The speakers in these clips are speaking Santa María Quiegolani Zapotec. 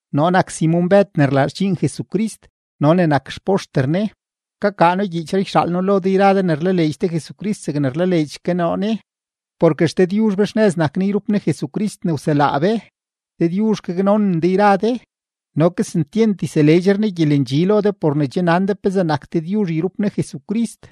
Noo nak Simon-Bëd ne rlaa xdxiin Jesucrist no ne nak xpoxter Ne. Kakaa noo gyiichree yxaal noo lo de yra de ne rlaleedx de Jesucrist zegne rlaleedx ke noo Ne, porke XDëdyuzh be xnëz nak Ne yrup Ne Jesucrist ne wselaa be. Dëdyuzh gaknonen de yra de no kesentyent yseleedxre Ne gyelendxi lo de por ne che nan de pezee nak Dëdyuzh yrup Ne Jesucrist.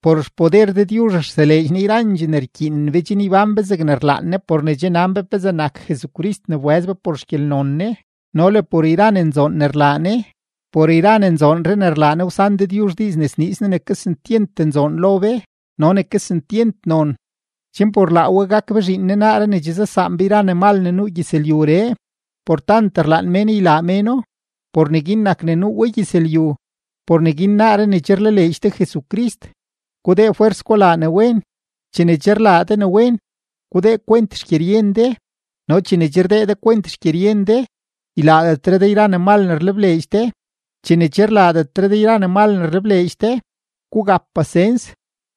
Por xpoder Dëdyuzh rseleedx Ne yrandxee ne rkyiinen be chen ybán be zegne rlaan Ne por ne che nan be pezee nak Jesucrist ne wbëz be por xgyelnon Ne no le por yra ne nzoon ne rlaa Ne. Por yra ne nzoonree ne rlaa Ne, wsan Dëdyuzh diiz ne sniiz Ne ne kesentyent nzoon lo be no ne kesentyent non, chen por laa we gak be zhiin Ne naaree ne che zasaan be ne mal ne nuu gyëzlyuree. Por tant rlaan mén ylaa méno, por neguin nak ne nuu we gyëzlyu. Por neguin naaree ne che rlaleedx de Jesucrist, gudee fwers gulaa ne wen; chene che rlaa de ne wen, gudee kwent xgyeryen de; no chene che rdee de kwent xgyeryen de, ylaadetre de yra ne mal ne rlebleedx de; chene che rlaadetre de yra ne mal ne rlebleedx de, gugap pasens;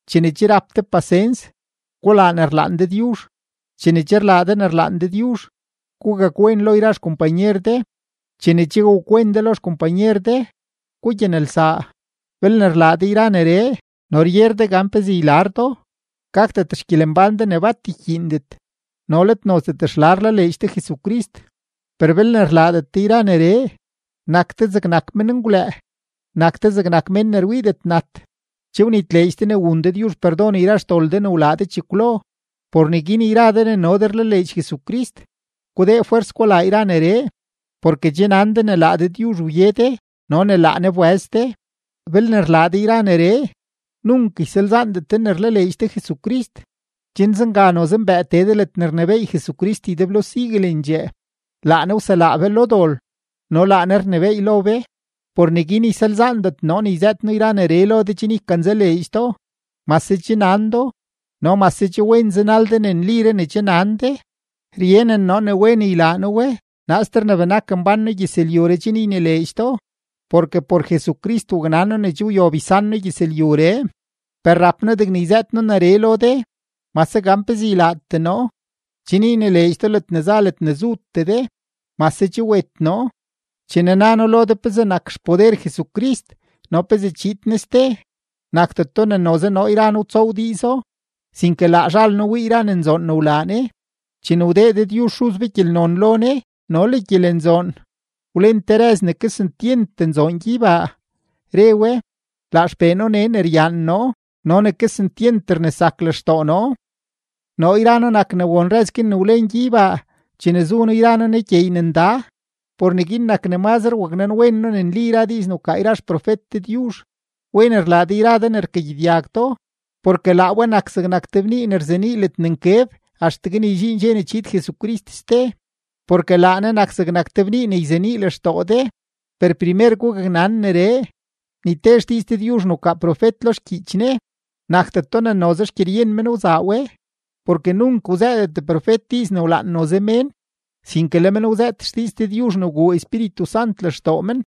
chene che rap de pasens, gulaa ne rlaan Dëdyuzh; chene che rlaa de ne rlaan Dëdyuzh, gugakwen lo yra xkompanyer de; chene che wakwen de lo xkompanyer de, gugyanelsaa. Belne rlaa de yra neree no ryer de gan pezee ylar do, gakdet xgyelembán de ne bat ykyiindet no let nozdet xla rlaleedx de Jesucrist. Per belne rlaadet de yra neree, nak de zegnak menngwlëë, nak de zegnak mén ne rwiidet nat, che wnitleedx de ne wun Dëdyuzh perdon yra xdol de ne wlaa de chekwlo. Por neguin yra de ne no de rlaleedx Jesucrist, gudee fwers gulaa yra neree, porke che nan de ne laa Dëdyuzh wye de no ne laa Ne wbëz de. Belne rlaa de yra neree, nunk ysalzaandet de ne rlaleedx de Jesucrist. Chen zenga noze mbëë tee de ledne rnebééy Jesucrist ydeblo siguelendxee; laa Ne wselaa be lo dol no laa Ne rnebééy lo be. Por neguin ysalzaandet noo yzëët noo yra neree lo de chen ykanzaleedx do, mase che nan do no mase che wen zanal de ne nliree ne che nan de. Ryenen noo ne wen ylaa noo we naaster ne benak mbán noo gyëzlyuree chen ynileedx do, porke por Jesucrist waknan noo ne che wyob ysan noo gyëzlyuree. Per rap noo degne yzëët noo neree lo de mase gan pezee ylaatee noo, chen ynileedx do ledne za ledne zutee de mase che wet noo. Chene na noo lo de pezee nak xpoder Jesucrist no pezee chiid Ne ste, nakdeto ne noze noo yra noo wtsoow diizo, sinke laa zhal noo wii yra ne nzoon ne wlaa Ne. Chene wdee Dëdyuzh Xuz be gyelnon lo Ne no le gyelenzoon, wlen te rëz ne kesentyent nzoon gyeybaa, re we: “Laa XPee noo nee ne ryaan noo no ne kesentyent rnesak lextoo noo.” Noo yra noo nak ne won rëz guin ne wlen gyeybaa chene zu noo yra noo Ne gyeey ne nda. Por neguin nak ne mazre waknanwen noo ne nli yra diiz ne wkaa yra xprofet Dëdyuzh. Wen rlaa de yra de ne rkagyedyag do, porke laa we nak zegnak te bnii ne rzenii ledne nkeb axtegue ne ydxiin dxe ne chiid Jesucrist ste; porke laa Ne nak zegnak te bnii ne yzenii lextoo de. Per primer gugaknan neree: ni te xdiiz Dëdyuzh ne wkaa profet lo xgyiich Ne, nakdeto ne noze xgyeryen men wzaa we, porke nunk wzëëdet profet diiz ne wlaan noze mén, sinke le men wzëët xdiiz Dëdyuzh ne wguu Espíritu Sant lextoo men.